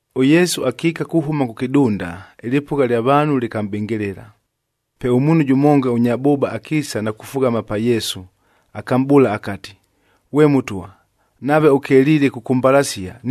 ɄYesu akiika kuhʉma kʉ kɨdunda, ɨlɨpʉgha lya vaanhu lɨkamʼbɨngɨlɨla. Pe ʉmuunhu jʉmonga ʉnya bʉʉba akiisa na kufughama pa Yesu, akamʼbʉʉla akati, “Ghwe Mʉtwa, nave ʉkeliile kʉkʉmbalasia,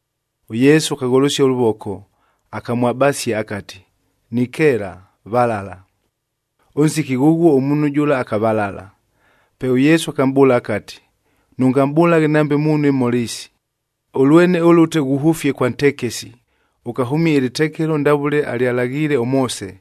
ɄYesu akagholosia ʉlʉvoko, akamwabasia akati, “Nikeela, valala!” Ʉnsiki ghʉghuo ʉmuunhu jʉla, akavalala. Pe ʉYesu akamʼbʉʉla akati, “Nʉngamʼbʉlaghe nambe muunhu imhola isi! Ʉlwene ʉlʉte ghuhʉfie kwa ntekesi, ʉkahʉmie ɨlɨtekelo ndavʉle alyalaghiile ʉMoose,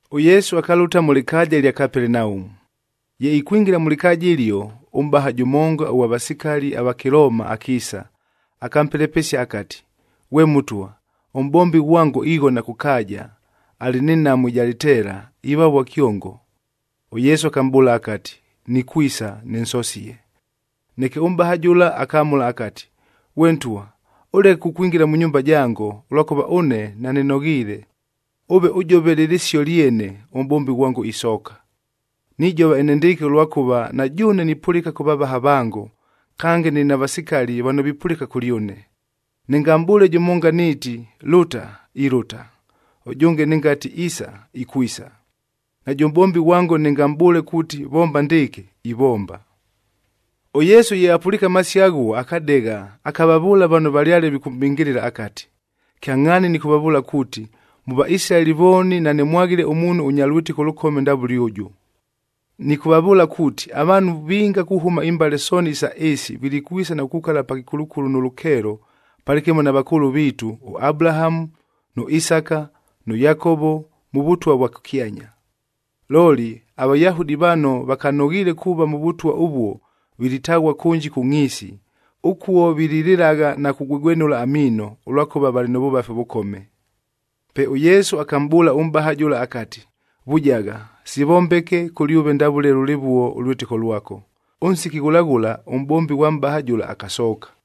ɄYesu akalʉta mʉ lɨkaaja ɨlya Kapelenaumu. Ye ikwingila mʉ lɨkaaja ɨlio, ʉmʼbaha jʉmonga ʉghwa vasikali ava Kɨlooma akiisa, akampelepesia akati, “Ghwe Mʉtwa, ʉmʼbombi ghwango ighona kʉ kaaja, alɨ nɨ nhamu ɨja lɨteela, ivavua kyongo.” ɄYesu akamʼbʉʉla akati, “Nikwisa, nɨnsosie.” Neke ʉmʼbaha jʉla akamʉla akati, “Ghwe Ntwa, ʉleke kukwingila mʉ nyumba jango, ʉlwakʉva ʉne nanɨnoghiile. Ʉve ʉjove lɨ lɨsio lyene, ʉmʼbombi ghwango isooka. Nijova enendɨɨkɨ, ʉlwakʉva na jʉʉne nipʉlɨka kʉ vavaha vango, kange nɨlɨ na vasikali vano vipʉlɨka kʉlyʉne. Nɨngamʼbʉʉle jʉmonga nɨɨti, ‘Lʉta!’ Ilʉta. Ʉjʉnge, nɨngati, ‘Isa!’ Ikwisa. Najʉ mʼbombi ghwango nɨngamʼbʉʉle kuuti, ‘Vomba ndɨɨkɨ!’ Ivomba.” ɄYesu ye apʉliike amasio aghuo, akadegha, akavavʉʉla vano valyale vikʉmʼbɨngɨlɨla akati, “Kyangʼhaani nɨkʉvavʉʉla kuuti, mʉ Vaisilaeli vooni nanɨmwaghile ʉmuunhu ʉnya lwɨtɨko ʉlʉkome ndavʉle ʉjʉ! Nɨkʉvavʉʉla kuuti, avaanhu vinga kuhʉma imbale sooni isa ɨɨsi vilikwisa na kukukala pa kɨkulukulu nʉ lʉkeelo palɨkɨmo na vakʉʉlʉ viitu ʉAbulahamu, nʉ Isaka, nʉ Yakovo mʉ Vʉtwa vwa kʉkyanya. Looli aVayahudi vano vakanoghiile kuuva mʉ Vʉtwa ʉvuo vilitaghua kʉnji kʉ ngʼhiisi, ʉkuo vililɨlagha na kugwegwenʉla amiino, ʉlwakʉva valɨ mʉ vʉvafi ʉvʉkome.” Pe ʉYesu akamʼbʉʉla ʉmʼbaha jʉla akati, “Vujagha! Sivombeke kʉlyʉve ndavʉle lʉlɨvuo ʉlwɨtɨko lwako.” Ʉnsiki ghʉla ghʉla, ʉmʼbombi ghwa mʼbaha jʉla akasooka.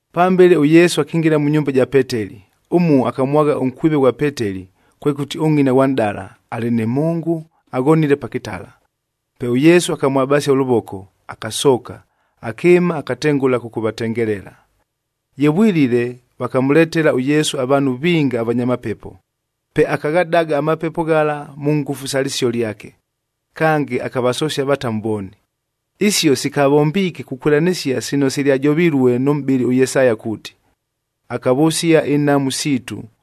Pambele ʉYesu akingila mʉ nyumba ja Peteli, ʉmuo akamwagha ʉnkwive ghwa Peteli, kwekʉti ʉngʼina ghwa nʼdala, alɨ nɨ mhʉngʉ, aghonile pa kɨtala. Pe ʉYesu akamwabasia ʉlʉvoko, akasooka, akɨɨma akatengʉla kʉkʉvatengelela. Ye vwilile, vakamʉletela ʉYesu avaanhu vinga avanya mapepo. Pe akaghadaga amapepo ghala mʉ ngʉfu sa lɨsio lyake. Kange, akavasosia avatamu vooni. Isio sikavombiike kukwɨlanɨsia sino silyajovilue nʉ mʼbɨli ʉYesaya kuuti, “Akavʉsia inhamu siitu,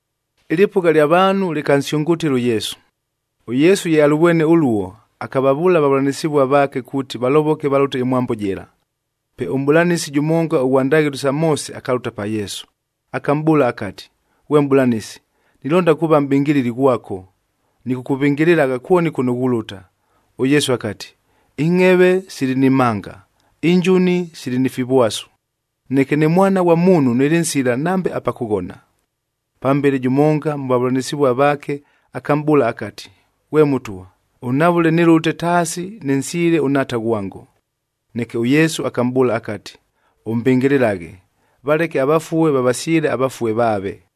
Ɨlɨpʉgha ɨlya vaanhu lɨkansyʉngʉtɨla ʉYesu. ɄYesu ye alʉvwene ʉluo, akavavʉʉla avavʉlanɨsɨvua vaake kuuti valovoke valʉte ɨmwambo jɨla. Pe ʉmʼbʉlanɨsi jʉmonga ʉghwa ndaghɨlo sa Moose akalʉta pa Yesu, akamʼbʉʉla akati, “Ghwe Mʼbʉlanɨsi, nilonda kuuva mʼbɨngɨlɨli ghwako, nɨkʉkʉvɨngɨlɨlagha kwoni kʉno ghulʉta.” ɄYesu akati, “Ingʼheve sili ni mhanga, injuni sili ni fivwasu, neke ne Mwana ghwa Muunhud nɨlɨ nsila nambe apa kʉghona!” Pambele, jʉmonga mʉ vavʉlanɨsɨvua vaake akamʼbʉʉla akati, “Ghwe Mʉtwa, ʉnhavʉle nɨlʉte taasi nɨnsyɨle ʉnhaata ghwango.” Neke ʉYesu akamʼbʉʉla akati, “Ʉmbɨngɨlɨlaghe! Valeke avafue vavasyɨle avafue vaave.”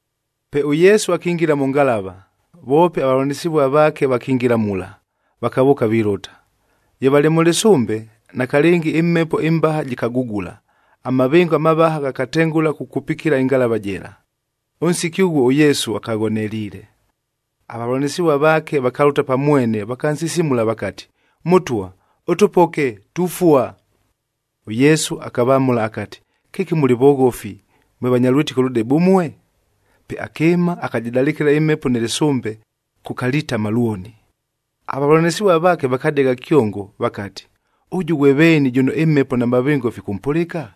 Pe ʉYesu akingila mʉ ngalava,e voope avavʉlanɨsɨvua vaake vakingila mula, vakavʉʉka vilʉta. Ye valɨ mʉ lɨsʉmbe, nakalɨngi ɨmhepo ɨmbaha jɨkagugula, amavɨngo amavaha ghakatengʉla kukupikila ɨngalava jɨla. Ʉnsiki ʉghuo ʉYesu akaghoneliile. Avavʉlanɨsɨvua vaake vakalʉta pa mwene vakansisimula vakati, “Mʉtwa, ʉtʉpoke! Tufua!” ɄYesu akavamʉla akati, “Kɨki mʉlɨ voghofi, mwe vanya lwɨtɨko lʉdebe ʉmue?” Pe akɨɨma, akajɨdalɨkɨla ɨmhepo nɨ lɨsʉmbe, kʉkalitama lwoni. Avavʉlanɨsɨvua vaake vakadegha kyongo vakati, “Ʉjʉ ghwe veeni jʉno ɨmhepo na mavɨngo fikʉmpʉlɨka?”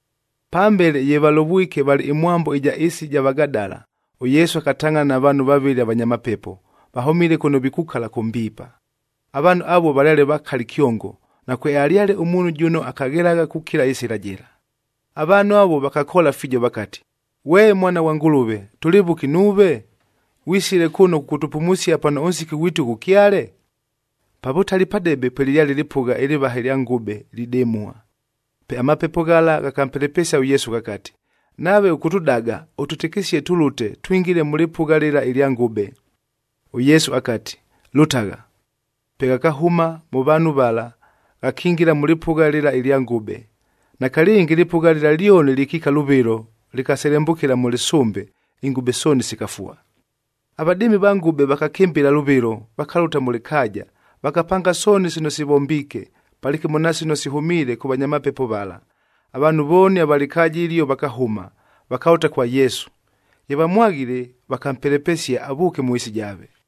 Pambele ye valovwike valɨ ɨmwambo ɨja ɨɨsi ɨja Vagadala, ʉYesu akatangʼhana na vaanhu vavɨlɨ avanya mapepo, vahʉmile kʉno vikukala kʉ mbiipa.f Avaanhu avuo valyale vakali kyongo, nakwealyale ʉmuunhu jʉno akaghelagha kukila ɨsɨla jɨla. Avaanhu avuo vakakoola fiijo vakati, “Ghwe Mwana ghwa Ngʉlʉve, tʉlɨ vʉki nuuve? Ghwisile kʉno kʉkʉtʉpumusia pano ʉnsiki ghwitu ghʉkyale?” Pa vʉtali padebe pwelɨlyale ɨlɨpʉgha ɨlɨvaha ɨlya ngʉbe lidɨmua. Pe amapepo ghala ghakampelepesia ʉYesu, ghakati, “Nave ʉkʉtʉdaga, ʉtwɨtɨkɨsie tʉlʉte, twingile mʉ lɨpʉgha lɨla ɨlya ngʉbe.” ɄYesu akati, “Lʉtagha!” Pe ghakahʉma mʉ vaanhu vala, ghakingila mʉ lɨpʉgha lɨla ɨlya ngʉbe. Nakalɨngi ɨlɨpʉgha lɨla lyoni lɨkiika lʉvɨlo, lɨkaselembʉkɨla mʉ lɨsʉmbe, ingʉbe sooni sikafua. Avadɨɨmi va ngʉbe vakakɨmbɨla lʉvɨlo, vakalʉta mʉ lɨkaaja, vakapanga sooni sino sivombiike, palɨkɨmo na sino sihʉmiile kʉ vanya mapepo vala. Avaanhu vooni ava lɨkaaja ɨlio vakahʉma, vakalʉta kwa Yesu. Ye vamwaghile, vakampelepesia avʉʉke mʉ ɨɨsi jaave.